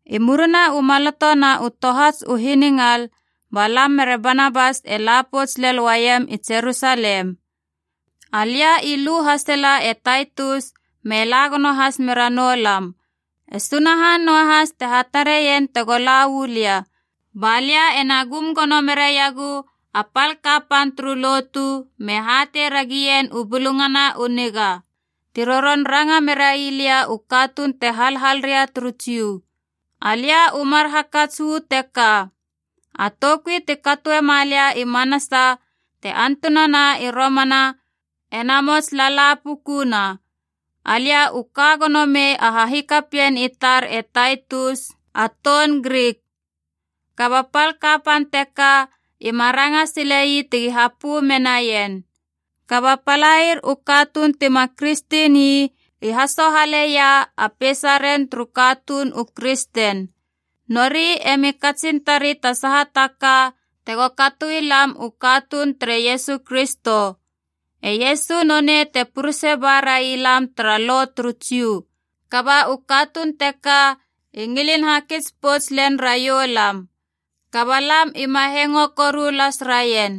I murina u maloto na u tohats u hiningal, ba lam mere Banabas e la pouts lel uaiem i Jerusalem. Alia i lu hasela e Taitus me la gono has mera noulam. E Sunahan noahas te hatarein tego la uu lia. Ba lia ena gum gono meraiegu a pal kapan turu Lotu me hatei ragien u Bulungana u Niga, ti roron ranga merai lia u katuun te halhal ria turu Jiu. Alia u mar hakats u teka: A toukui ti katoema lia i manasa te antunana i romana ena mots lalapukuna. Alia u ka gonomei a hahikapien i tar e Taitus a toun Grik, kaba pal kapan teka ima ranga sile ii tegi hapö menaien. Kaba palair u katuun tima kristen ii hasohaleia a peisaren turu katuun u kristen. Nori emi katsin tari ta saha ka tego katoi lam u katuun tere Iesu Kristo. E Iesu nonei te purese ba raialam tara Lo turu Jiu, kaba u katuun teka i ngilin hakits pouts len raiou lam. Kaba lam ima hengo koru las raien.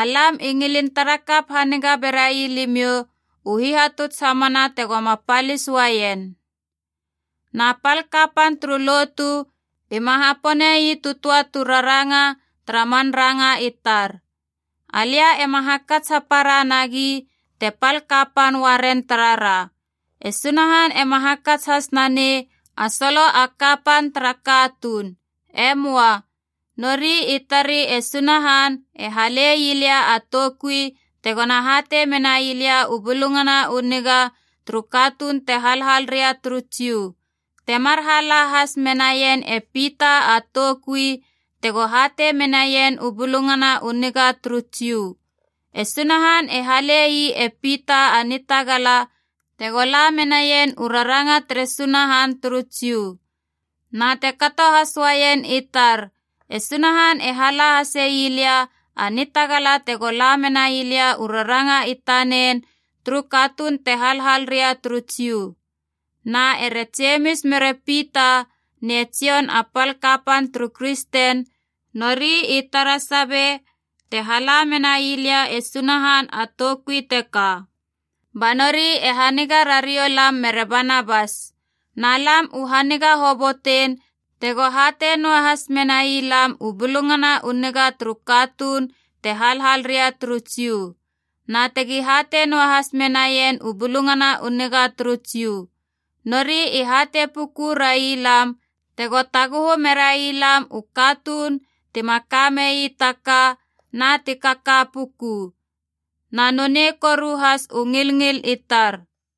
Alam i ngilin tara kap haniga berai limiou u hihatuts hamana tegoma palis uaien. Na pal kapan turu lotu ima hapone ii tu töa tu raranga tara man ranga i tar. Alia ema hakats hapara nagi te pal kapan uaren taraha, e Sunahan ema hakats has nanei a solo a kapan tara katuun. E möa. Nori i tari e Sunahan e hale ii lia a toukui tegona hatei menai lia u Bulungana u Niga turu katuun te halhal ria turu Jiu, temar hala has menaien e Pita a toukui tego hatei menaien u Bulungana u Niga turu Jiu. E Sunahan e hale ii e Pita a nitagala tego la menaien u raranga tere Sunahan turu Jiu. Na te kato has uaien i tar e Sunahan e hala hase ii lia a nitagala tego la menai lia u raranga i tanen turu katuun te halhal ria turu Jiu. Na ere Jemis mere Pita ne Jon a pal kapan turu Kristen, nori i tara sabe te hala menai lia e Sunahan a toukui teka, ba nori e haniga rariou lam mere Banabas. Na lam u haniga hobotein tego hatei noahas menai lam u Bulungana u Niga turu katuun te halhal ria turu Jiu, na tegi hatei noahas menaien u Bulungana u Niga turu Jiu. Nori i hatei puku railam tego taguhu merai lam u katuun tima kamei taka na ti kaka puku, na nonei koru has u ngilngil i tar.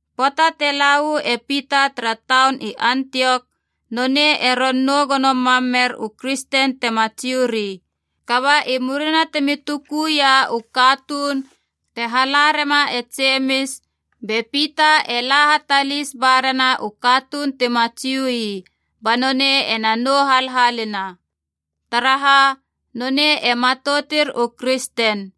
Pöata te la uu e Pita tara taun i Antiok, nonei e ron nou gono mam mer u kristen tima Jiu ii. Kaba i murina timi tukuia u katuun te hala rema e Jemis, be Pita e la hatalis ba rena u katuun tima Jiu ii, ba nonei ena nou halhalina. Taraha, nonei e matoutir u kristen,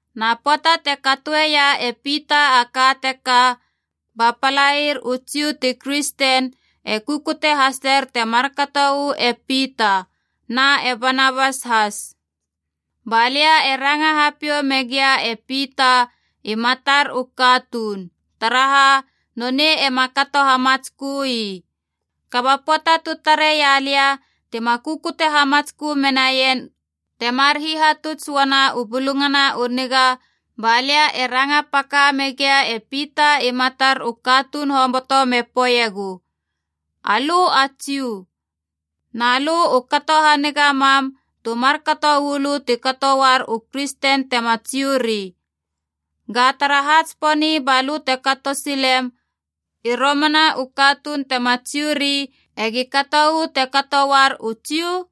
Na pöata te katoeia e Pita a ka teka, ba palair u Jiu ti kristen e kukute haser te markato uu e Pita, na e Banabas has. Ba lia e ranga hapiou megia e Pita i matar u katuun, taraha nonei ema kato hamatskö ii. Kaba pöata tu tareia lia tima kukute hamatskö menaien temar hihatuts uana u Bulungana u Niga, ba lia e ranga paka megia e Pita i matar u katuun hoboto me poeiegu, “Alö a Jiu. Na lö u kato haniga mam tu markato uu lö te kato uar u Kristen te tema Jiuri. Ga taraha tsiponi ba lö te kato silem i romana u katun te tema Jiuri e gi kato uu te kato uar u Jiu?”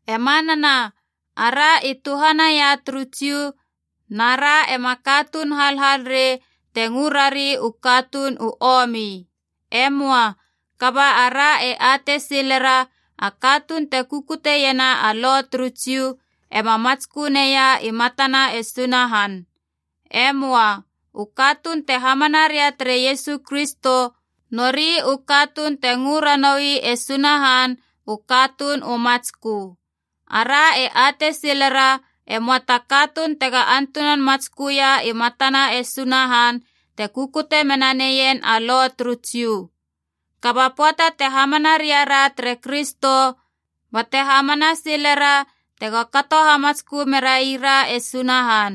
E manana ara i tuhanaia turu Jiu na ra ema katuun halhal rei te ngö rari u katuun u omi. E möa. Kaba ara e atei silera a katuun te kukuteiena a Lo turu Jiu ema matskö neia i matana e Sunahan. E möa. U katuun te hamana ria tere Iesu Kristo, nori u katuun te ngö ranoui e Sunahan u katuun u matskö. Ara e atei silera e möa ta katuun tega antunan matsköia i matana e Sunahan te kukute mena neien a Lo turu Jiu. Kaba pöata te hamana ria ra tere Kristo bate hamana silera tego kato hamatskö merai ra e Sunahan,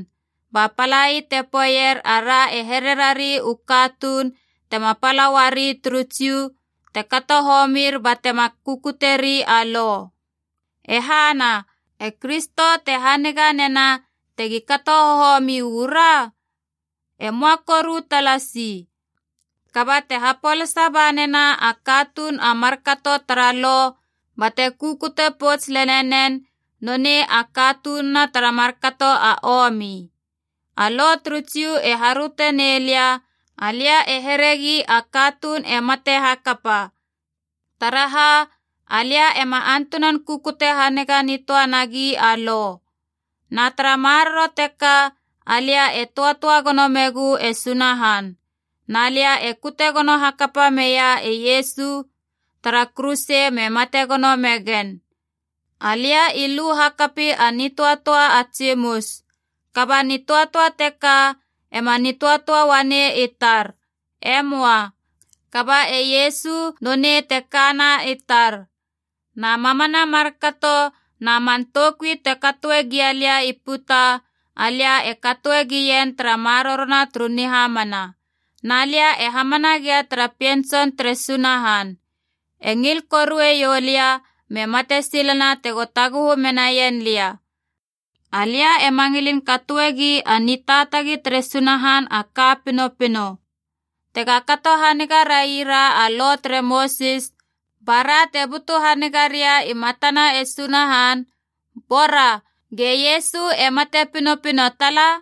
ba palai te poeier ara e here rari u katuun tema pala uari turu Jiu te kato homir batema kukutieri a Lo. E hana, e Kristo te haniga nena tegi kato homi u ra? E möa koru talasi! Kaba te hapolasa ba nena a katuun a markato tara Lo bate kukute pouts lele nen, nonei a katununa tara markato a omi. A Lo turu Jiu e haröte nei lia, alia e heregi a katuun e mate hakapa, taraha alia ema antunan kukute haniga nitöa nagi a Lo. Na tara maroro teka alia e töatöa gono megu e Sunahan. Na lia u kute gono hakapa meia e Iesu tara kuruse me mate gono megen. Alia i lu hakapi a nitöatöa a tsimus. Kaba nitöatöa teka ema nitöatöa uanei i tar. Emoa. Kaba e Iesu nonei te kana i tar. Na mamana markato na man toukui te katoe gialia i puta, alia e katoe gien tara marorona turu nihamana. Na lia e hamana gia tara Pien Tson tere Sunahan. E ngil korue ioulia me mate silena tego taguhu menaien lia. Alia ema ngilin katoegi a nitaatagi tere Sunahan a ka pinopino. Tega kato haniga raira a Lo tere Mosis ba ra te butu haniga ria i matana e Sunahan, bora, ge Iesu e mate pinopino tala.